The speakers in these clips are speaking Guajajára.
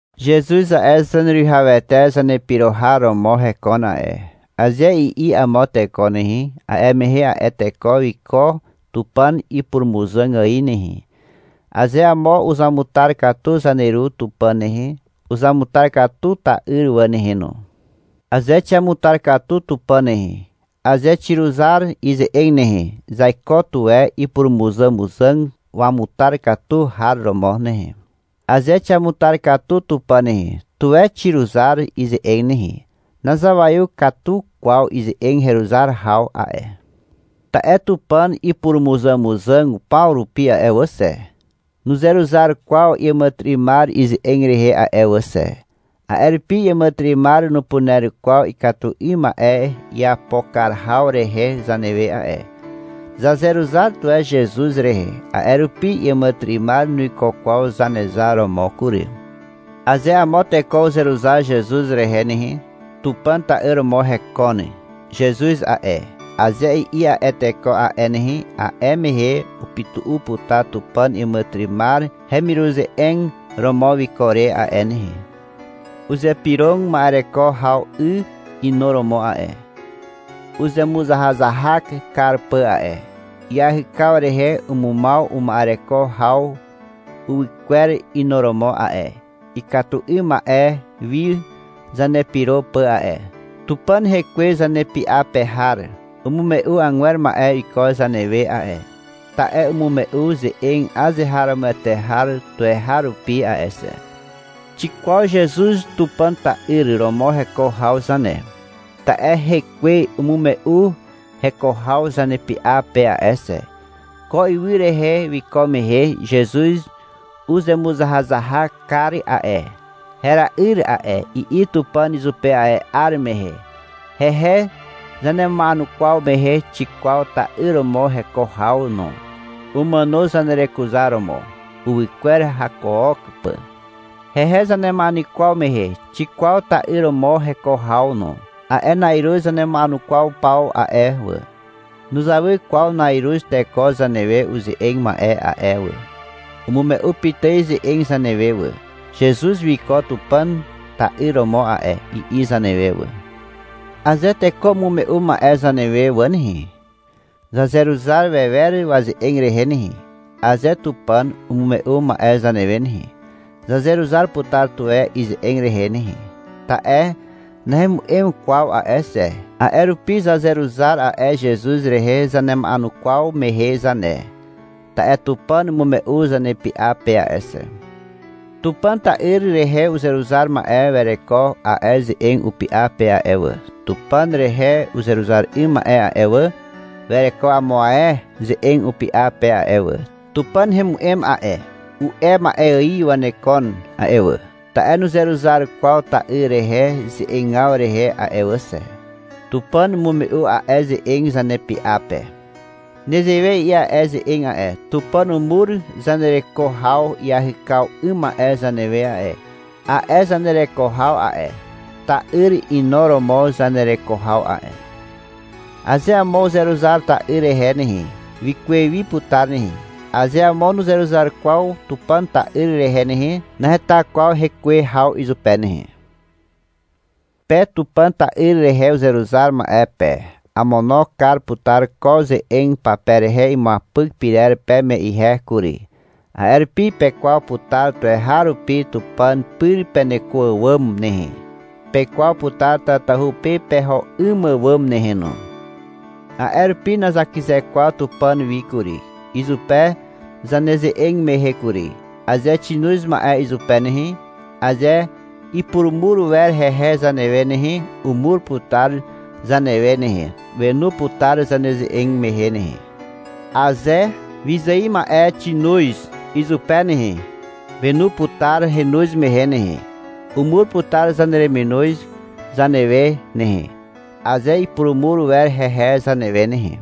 — Zezuz a'e, Zaneruwihawete Zanepyro har romo hekon a'e, aze i'i amo teko nehe, a'e mehe a'e teko wiko Tupàn ipurumuzàg ài nehe. Aze amo uzamutar katu Zaneru Tupàn nehe, uzamutar katu ta'yr wà nehe no. Aze xiamutar katu Tupàn nehe, aze xiruzar ize'eg nehe, zaiko tuwe ipurumuzàmuzàg wamutar katu har romo nehe. Aze xiamutar katu Tupàn nehe, tuwe xiruzar ize'eg nehe. Nazawaiw katu kwaw ize'eg heruzar haw a'e. Ta'e Tupàn ipurumuzàmuzàg paw rupi a'e wà xe, nuzeruzar kwaw iàmàtyry'ymar ize'eg rehe a'e wà xe. A'e rupi iàmàtyry'ymar nupuner kwaw ikatu 'ym ma'e iapo kar haw rehe zanewe a'e. Zazeruzar tuwe Zezuz rehe, a'e rupi iàmàtyry'ymar nuiko kwaw Zanezar romo kury. Aze amo teko uzeruzar Zezuz rehe nehe, — Tupàn ta'yr romo hekon Zezuz a'e, aze i'i a'e teko a'e nehe, a'e mehe upytu'u putar Tupàn iàmàtyry'ymar hemiruze'eg romo wiko re a'e nehe. Uzypyrog ma'ereko haw 'y inuromo a'e, uzemuzahazahak kar pà a'e. Iahykaw rehe umumaw uma'ereko haw uwykwer inuromo a'e, ikatu 'ym ma'e wi zanepyro pà a'e. Tupàn Hekwe zanepy'a pe har umume'u agwer ma'e iko zanewe a'e, ta'e umume'u ze'eg azeharomoete har tuweharupi a'e xe. Xikwaw Zezuz Tupàn ta'yr romo heko haw zane, ta'e Hekwe umume'u heko haw zanepy'a pe a'e xe. Ko ywy rehe wiko mehe Zezuz uzemuzahazahak kar a'e. — Hera'yr a'e, i'i Tupàn izupe a'e 'ar mehe. Hehe zanema'enukwaw mehe xikwaw ta'yr romo heko haw no. Umàno zanerekuzaromo, uwykwer hakook pà. Hehe zanema'enukwaw mehe xikwaw ta'yr romo heko haw no. A'e na'iruz zanema'enukwaw paw a'e wà, nuzawy kwaw na'iruz teko zanewe uze'eg ma'e a'e wà. Umume'u pitài ze'eg zanewe wà. — Zezuz wiko Tupàn ta'yr romo a'e, i'i zanewe wà. Aze teko umume'u ma'e zanewe wà nehe, zazeruzar wewer waze'eg rehe nehe. Aze Tupàn umume'u ma'e zanewe nehe, zazeruzar putar tuwe ize'eg rehe nehe, ta'e nahemu'em kwaw a'e xe. A'e rupi zazeruzar a'e Zezuz rehe zanema'enukwaw mehe zane, ta'e Tupàn umume'u zanepy'a pe a'e xe. Tupàn ta'yr rehe uzeruzar ma'e wereko a'e ze'eg upy'a pe a'e wà. Tupàn rehe uzeruzar 'ym ma'e a'e wà, wereko amo ae ze'eg upy'a pe a'e wà. — Tupàn hemu'em a'e, u'e ma'e ài wanekon a'e wà, ta'e nuzeruzar kwaw ta'yr rehe ze'egaw rehe a'e wà xe. Tupàn umume'u a'e ze'eg zanepy'a pe. Nezewe i'i a'e ze'eg a'e. — Tupàn umur zanereko haw iahykaw 'ym ma'e zanewe a'e. A'e zanereko haw a'e, ta'yr inuromo zanereko haw a'e. Aze amo uzeruzar ta'yr rehe nehe, wikuwe wi putar nehe. Aze amo nuzeruzar kwaw Tupàn ta'yr rehe nehe, naheta kwaw hekuwe haw izupe nehe. Pe Tupàn ta'yr rehe uzeruzar ma'e pe, amono kar putar ko ze'eg pape rehe imuapyk pyrer peme ihe kury. A'e rupi pekwaw putar tuweharupi Tupàn pyr peneko àwàm nehe. (Pekwaw putar tatahu pe peho 'ym àwàm nehe no.) A'e rupi nazakyze kwaw Tupàn wi kury, izupe zaneze'eg mehe kury. Aze xinoz ma'e izupe nehe, aze ipurumur wer hehe zanewe nehe, umur putar zanewe nehe. Wenu putar zaneze'eg mehe nehe. Aze wyzài ma'e xinoz izupe nehe. Wenu putar henoz mehe nehe. Umur putar zanereminoz zanewe nehe, (aze ipurumur wer hehe zanewe nehe).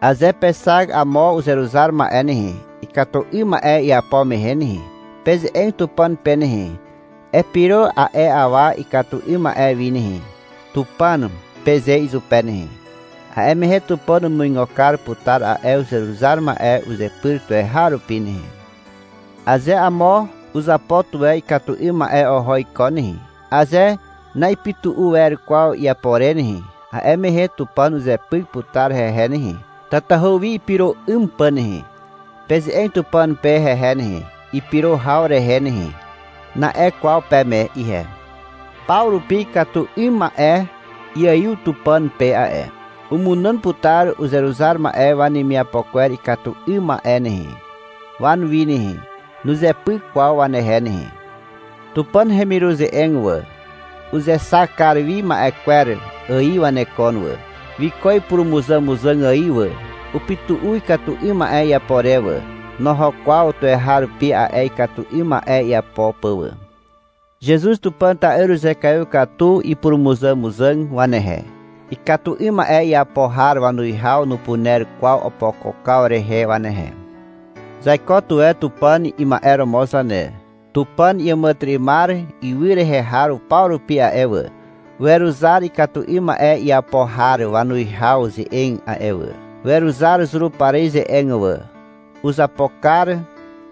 Aze pexak amo uzeruzar ma'e nehe, ikatu 'ym ma'e iapo mehe nehe, peze'eg Tupàn pe nehe. — Epyro a'e awa ikatu 'ym ma'e wi nehe, Tupàn, peze izupe nehe. A'e mehe Tupàn umuigo kar putar a'e uzeruzar ma'e uzepyr tuweharupi nehe. Aze amo uzapo tuwe ikatu 'ym ma'e oho iko nehe, aze na'ipytu'u wer kwaw iapo re nehe, a'e mehe Tupàn uzepyk putar hehe nehe, tatahu wi ipyro 'ym pà nehe. — Peze'eg Tupàn pe hehe nehe, ipyro haw rehe nehe, na'e kwaw peme ihe. Paw rupi ikatu 'ym ma'e iaiw Tupàn pe a'e. Umunàn putar uzeruzar ma'e wanemiapo kwer ikatu 'ym ma'e nehe, wanuwi nehe. Nuzepyk kwaw wanehe nehe. Tupàn hemiruze'eg wà, uzexak kar wi ma'e kwer ài wanekon wà, wiko ipurumuzàmuzàg ài wà. Upytu'u ikatu 'ym ma'e iapo re wà. Noho kwaw tuweharupi a'e ikatu 'ym ma'e iapo pà wà. Zezuz Tupàn ta'yr uzekaiw katu ipurumuzàmuzàg wanehe. Ikatu 'ym ma'e iapo har wanuwihaw nupuner kwaw opokokaw rehe wanehe. Zaiko tuwe Tupàn ima'e romo zane. Tupàn iàmàtyry'ymar ywy rehe har paw rupi a'e wà, weruzar ikatu 'ym ma'e iapo har wanuwihaw ze'eg a'e wà. (Weruzar Zurupari ze'eg wà.) Uzapo kar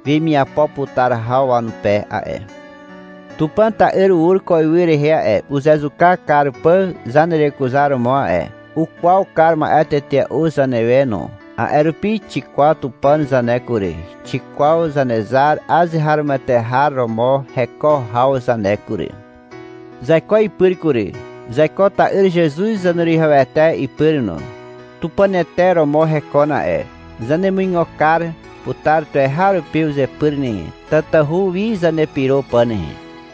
wemiapo putar haw wanupe a'e. Tupàn ta'yr ur ko ywy rehe a'e, uzezuka kar pà zanerekuzaromo a'e. Ukwaw kar ma'e tetea'u zanewe no. A'e rupi xikwaw Tupàn zane kury, xikwaw Zanezar azeharomoete har romo heko haw zane kury. Zaiko ipyr kury. Zaiko ta'yr Zezuz Zaneruwihawete ipyr no. Tupànete romo hekon a'e. Zanemuigo kar putar tuweharupi uzepyr nehe, tatahu wi zanepyro pà nehe.